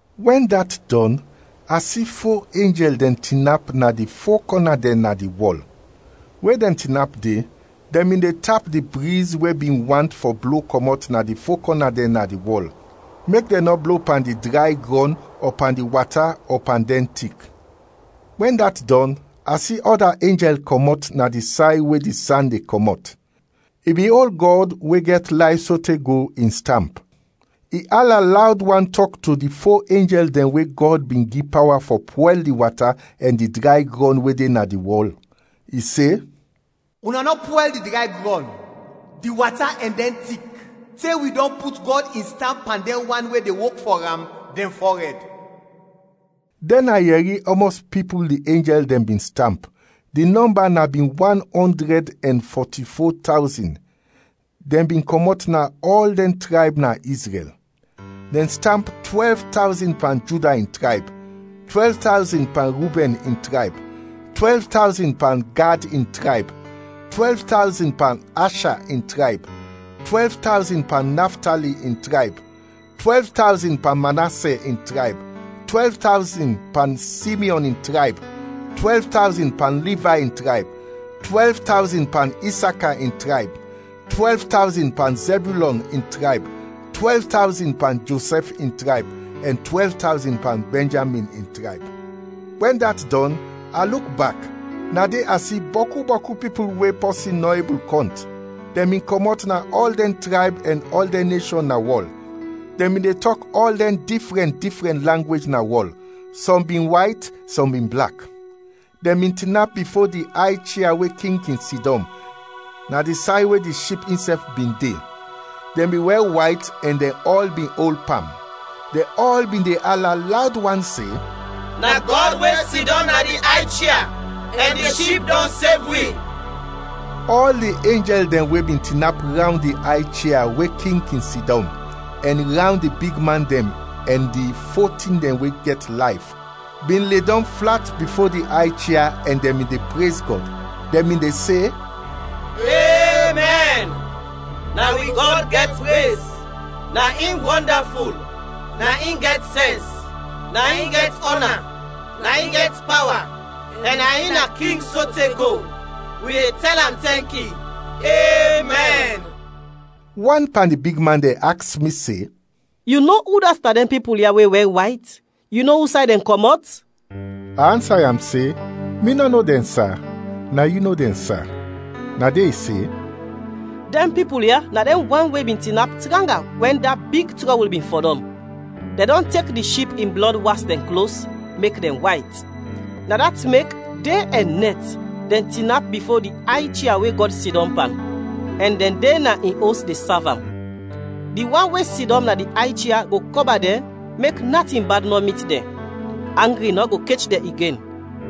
Wɛn dat dɔn, a si fo enjɛl dɛn tinap na di fo kɔna dɛn na di wɔl. We dɛn tinap de, dɛn bin de tap di briz we bin want fɔ blo kɔmɔt na di fo kɔna dɛn na di wɔl, mek dɛn nɔ blo pan di dray grɔn ɔ pan di wata ɔ pan dɛn tik. Wɛn dat dɔn, a si ɔda enjɛl kɔmɔt na di say we di san de kɔmɔt. I bin ol Gɔd, we gɛt layf sote go, in stamp. I ala lawd wan tɔk to di fo enjɛl dɛn we Gɔd bin gi pawa fɔ pwɛl di wata ɛn di dray grɔn we de na di wɔl. I se, “Una nɔ pwɛl di dray grɔn, di wata ɛn dɛn tik, te wi dɔn put Gɔd in stamp pan dɛn wan we de wok fɔ am, dɛn fɔrɛd.” Dɛn a yɛri ɔmɔs pipul di enjɛl dɛn bin stamp; di nɔmba na bin wan ɔndrɛd ɛn fɔti-fo tawzin, dɛn bin kɔmɔt na ɔl dɛn trayb na Izrɛl. Dɛn stamp twɛlv tawzin pan Juda in trayb; twɛlv tawzin pan Rubɛn in trayb; twɛlv tawzin pan Gad in trayb; twɛlv tawzin pan Asha in trayb; twɛlv tawzin pan Naftali in trayb; twɛlv tawzin pan Manasɛ in trayb; twɛlv tawzin pan Simyɔn in trayb; twɛlv tawzin pan Livay in trayb; twɛlv tawzin pan Isaka in trayb; twɛlv tawzin pan Zɛbyulɔn in trayb; twɛlv tawzin pan Josɛf in trayb; ɛn twɛlv tawzin pan Bɛnjamin in trayb. Wɛn dat dɔn, a luk bak, na de a si bɔku bɔku pipul we pɔsin nɔ ebul kɔnt. Dɛn bin kɔmɔt na ɔl dɛn trayb ɛn ɔl dɛn neshɔn na wɔl, dɛn bin de tɔk ɔl dɛn difrɛn difrɛn langwej na wɔl, sɔm bin wayt, sɔm bin blak. Dɛn bin tinap bifo di ay chia we king kin sidɔm, na di say we di Ship insɛf bin de; dɛn bin wɛr wayt ɛn dɛn ɔl bin ol pam. Dɛn ɔl bin de ala lawd wan se, “Na Gɔd we sidɔm na di ay chia ɛn di Ship dɔn sev wi!” Ɔl di enjɛl dɛn we bin tinap rawnd di ay chia we king kin sidɔm, ɛn rawnd di bigman dɛn ɛn di fo tin dɛn we gɛt layf, bin ledɔm flat bifo di ay chia ɛn dɛn bin de prez Gɔd. Dɛn bin de se, “Emɛn! Na wi Gɔd gɛt prez, na in wɔndaful, na in gɛt sɛns, na in gɛt ɔna, na in gɛt pawa ɛn na in na king sote go; wi de tɛl am tɛnki! Emɛn!” Wan pan di bigman dɛn aks mi se, “Yu no udat na dɛn pipul ya we wɛr wayt? Yu no usay dɛn kɔmɔt?” A ansa am se, “Mi nɔ no dɛn, sa. Na yu no dɛn, sa.” Na de i se, “Dɛn pipul ya na dɛn wan we bin tinap tranga wɛn da big trɔbul bin fɔdɔm. Dɛn dɔn tek di Ship in blɔd was dɛn klos, mek dɛn wayt. Na dat mek, de ɛn nɛt, dɛn tinap bifo di ay chia we Gɔd sidɔm pan, ɛn dɛn de na in os de sav am. Di wan we sidɔm na di ay chia go kɔba dɛn mek natin bad nɔ mit dɛn. Angri nɔ go kech dɛn igen,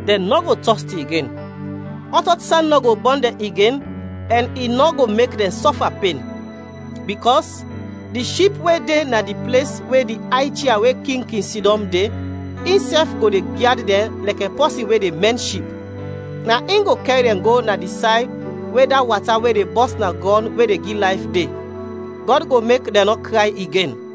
dɛn nɔ go tɔsti igen, ɔt ɔt san nɔ go bɔn dɛn igen ɛn i nɔ go mek dɛn sɔfa pen, bikɔs di Ship we de na di ples we di ay chia we king kin sidɔm, de, insɛf go de gyad dɛn lɛkɛ pɔsin we de mɛn ship. Na in go kɛr dɛn go na di say we da wata we de bɔs na grɔn we de gi layf, de. Gɔd go mek dɛn nɔ kray igen.”